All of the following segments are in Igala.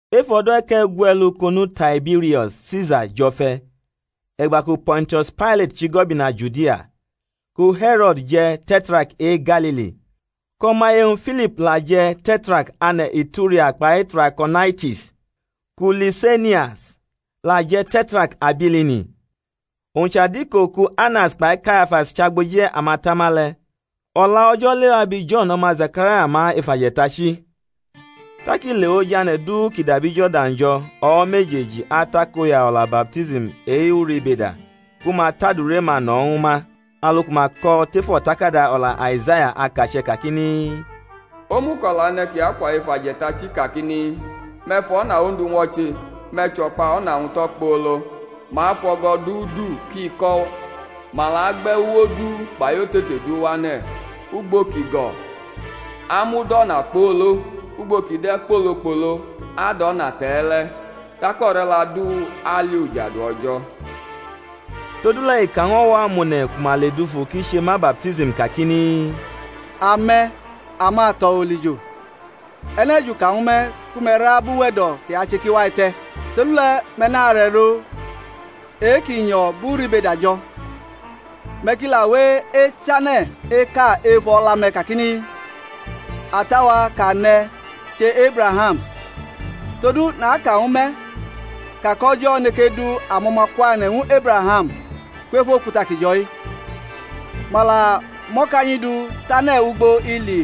Ef o̩do̩ e̩ke̩gwe̩lu kʼonu Taibirio̩s Sisa jʼo̩fe̩, e̩gba ku Po̩ntius Pailat chʼigo̩bina Judia, ku He̩ro̩d je̩ Te̩trark e-Galili, kʼo̩maye-wñ Filip la je̩ Te̩trark ane̩ Ituria kpai Trako̩naitis, ku Lise̩nias la je̩ Te̩trark Abilini, owñ chʼadiko ku Anas kpai Kayafas chʼagboji amatama le̩, O̩la O̩jo̩ lewa abi Jo̩n, o̩ma Zekaraya, ma ef aje̩tachi. Tak i lewʼoj ane̩ du ki dabi Jo̩rdan jo̩ o̩wo̩ mejeji atakoya o̩la baptism e-uribeda ku ma tʼadure-ma no̩ ñwu ma; alu ku ma ko̩ tef o̩takada o̩la Aizaya akache̩ kakini, O̩muko̩la e̩ne̩ kʼi akwa ef aje̩tachi kakini, Me̩ fʼo̩na Ondu ñwo̩che, me̩ chʼo̩kpa o̩na-wñ tʼo̩kpolo. Ma afʼo̩go̩ du du kʼi ko̩; ma la agbe̩ uwo du kpai otete du wane̩; ugbo ki go̩ amud o̩na kpolo, ugbo ki de̩ kpolokpolo adʼo̩na te̩e̩le̩; tak o̩re̩la du ali ujadu O̩jo̩. Todule̩ i ka ñw o̩wo̩ amone̩ ku ma ledufu kʼi che ma baptism kakini, Ame̩ amato̩ olijo, e̩ne̩ juka ñwu me̩ ku me̩ ra bʼuwe̩do̩ ki ache ki wa te̩? Todule̩ me̩ naro e̩ro e-ki nyo̩ bʼuribeda jo̩, me̩ ki la we echane̩ eka efu o̩la-me̩ kakini, Ata-wa kʼa ne̩ chʼEbraham; todu naka ñwu me̩ ka kʼO̩jo̩ neke du amo̩ma kwane̩ ñw Ebraham kwef okuta ki jo̩-i. Ma la mʼo̩kanyi du tʼane̩ ugbo ili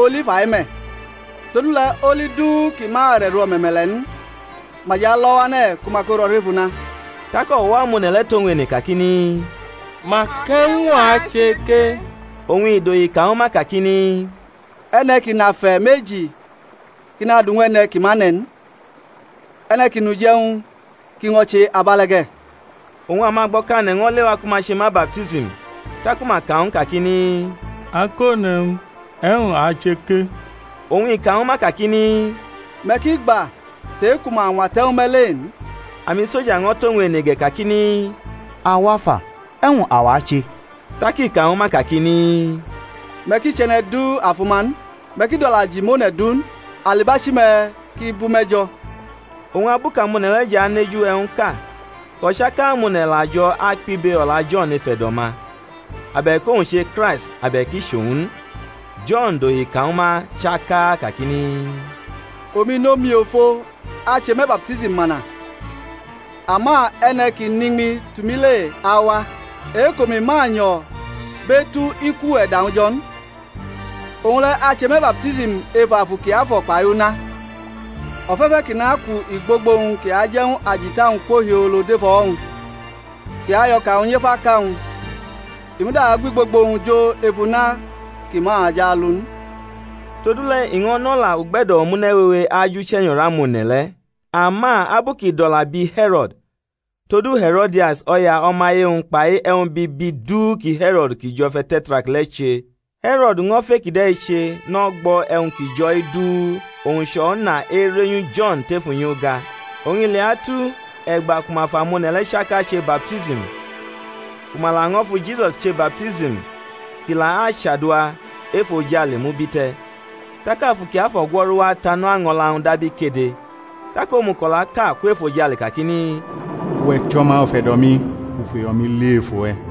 oli fa-i me̩; todule̩ oli du ki ma arʼe̩ro o̩me̩me̩le̩ n, ma jʼalo̩ wane̩ ku ma ko ro̩ rʼef una. Tak o̩wo̩ amone̩ le̩ tʼowñ ene kakini, Mak e̩wñ a che ke? Oñ i dohi ka ñwu ma kakini, E̩ne̩ ki nʼafe̩ meji ki nadʼu ñw e̩ne̩ ki ma ne̩ n; e̩ne̩ ki nʼuje̩wñ ki ño̩ che abe̩le̩ ge̩. Oñ amagbo̩kane̩ ño̩ lewa ku ma che ma baptism, taku ma ka ñw u kakini, Akone̩wñ, e̩wñ a ache ke? Oñ i ka ñwu ma kakini, Me̩ ki gba tʼe-ku ma ñwate̩ ñwu me̩ le n. Amisoja ño̩ tʼowñ ene ge̩ kakini, Awa fa, e̩wñ awa ache? Tak i ka ñwu ma kakini, Me̩ ki chʼe̩ne̩ du afuma n, me̩ ki dʼo̩la ji mʼone̩ du n; alibachi-me̩ ki bʼume̩ jo̩. Oñ abu kʼamone̩ le̩ jʼaneju e̩wñʼka kʼo̩chaka amone̩ la jo̩ akpibe o̩la Jo̩n ef e̩do̩-ma, abe̩k owñ che Kraist abe̩k i chʼowñ n, Jo̩n dohi ka ñwu ma chaka kakini, Omi nʼomiofo ache me̩ baptism mana; ama e̩ne̩ ki nʼiñmi tʼumi le awa, e-kʼomi ma nyo̩ bʼetu iku e̩da-wñ jo̩ n; owñ le̩ ache me̩ baptism ef Afu Kiafo̩ kpai una; o̩fe̩fe̩ kʼi nʼakwu igbogbo-wñ kʼi aje̩ ñw ajita-wñ kwo hiolo dʼef o̩wo̩-wñ, kʼi ayʼo̩ka-wñ nyef aka-wñ; i muda agwʼigbogbo-wñ jo ef una ki ma jʼalu n. Todule̩ i ño̩ nʼo̩la ugbe̩do̩ omune̩ wewe ajʼuche̩nyo̩ rʼamone̩ le̩; ama abu kʼi dʼo̩la bi He̩ro̩d, todu He̩ro̩dias, o̩ya o̩maye-wñ, kpai e̩wñ bibi du ki He̩ro̩d ki jʼo̩fʼe̩ Te̩trark le̩ che, He̩ro̩d ño̩ fʼe-kide̩ che nʼo̩gbo̩ e̩wñ ki jo̩-i du owñ chʼo̩na erenyu Jo̩n tef unyi-uga. Oñ i leatu, e̩gba ku ma fʼamone̩ le̩ chaka che baptism, ku ma laño̩ fu Jisusi che baptism kʼi la achadua, efojale mubite̩, tak Afu Kiafo̩ gwo̩ru wa tanʼo, año̩la-wñ dab ikede, tak omuko̩la ka kwʼefojale kakini, Uwe̩ chʼO̩ma ufe̩do̩-mi; u fʼuyo̩-mi li ef uwe̩.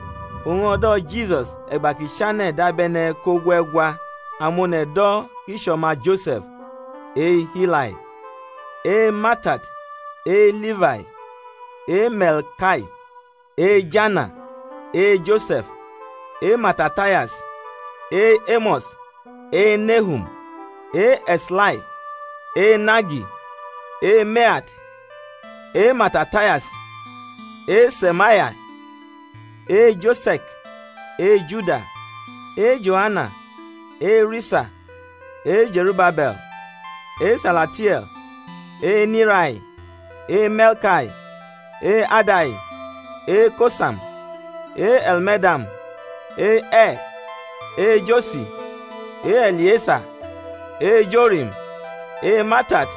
Oñ o̩do̩ Jisus e̩gba kʼi chane̩ dabe̩ne̩ kʼogue̩gwa; amone̩ do̩ kʼi chʼo̩ma Jose̩f e-Hifai, e-Matat, e-Lifai, e-Me̩lkai, e-Jana, e-Jose̩f, e-Matatayas, e-Emo̩s, e-Nehum, e-E̩slai, e-Nagi, e-Me̩at, e-Matatayas, e-Se̩me̩ai, e-Jose̩k, e-Juda, e-Joana, e-Risa, e-Ze̩rubabe̩l, e-Salatie̩l, e-Nirai, e-Me̩lkai, e-Adai, e-Kosam, e-Elmedam, e-E̩r, e-Josi, e-E̩liesa, e-Jorim, e-Matat,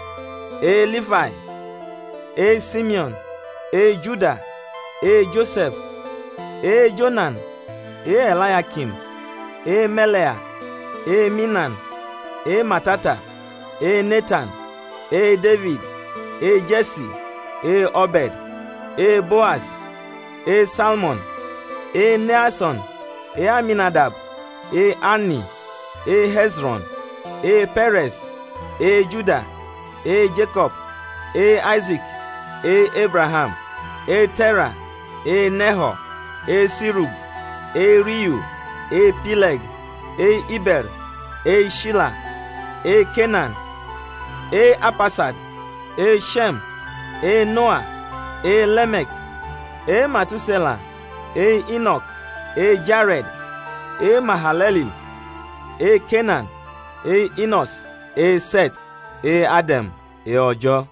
e-Lifai, e-Simeo̩n, e-Juda, e-Jose̩f, e-Jonan, e-E̩layakim, e-Me̩le̩a, e-Minan, e-Matata, e-Netan, e-Defid, e-Je̩si, e-Obe̩d, e-Boas, e-Salmon, e-Neason, e-Aminadab, e-Ami, e-He̩zro̩n, e-Pe̩re̩s, e-Juda, e-Jeko̩b, e-Aise̩k, e-Ebraham, e-Te̩ra, e-Neho̩r, e-Sirug, e-Riyu, e-Pile̩g, e-Ibe̩r, e-Shila, e-Kenan, e-Arpaksad, e-She̩m, e-Noa, e-Leme̩k, e-Matuse̩la, e-Ino̩k, e-Jare̩d, e-Mahale̩lil, e-Kenan, e-Ino̩s, e-Se̩t, e-Ade̩m, e-O̩jo̩.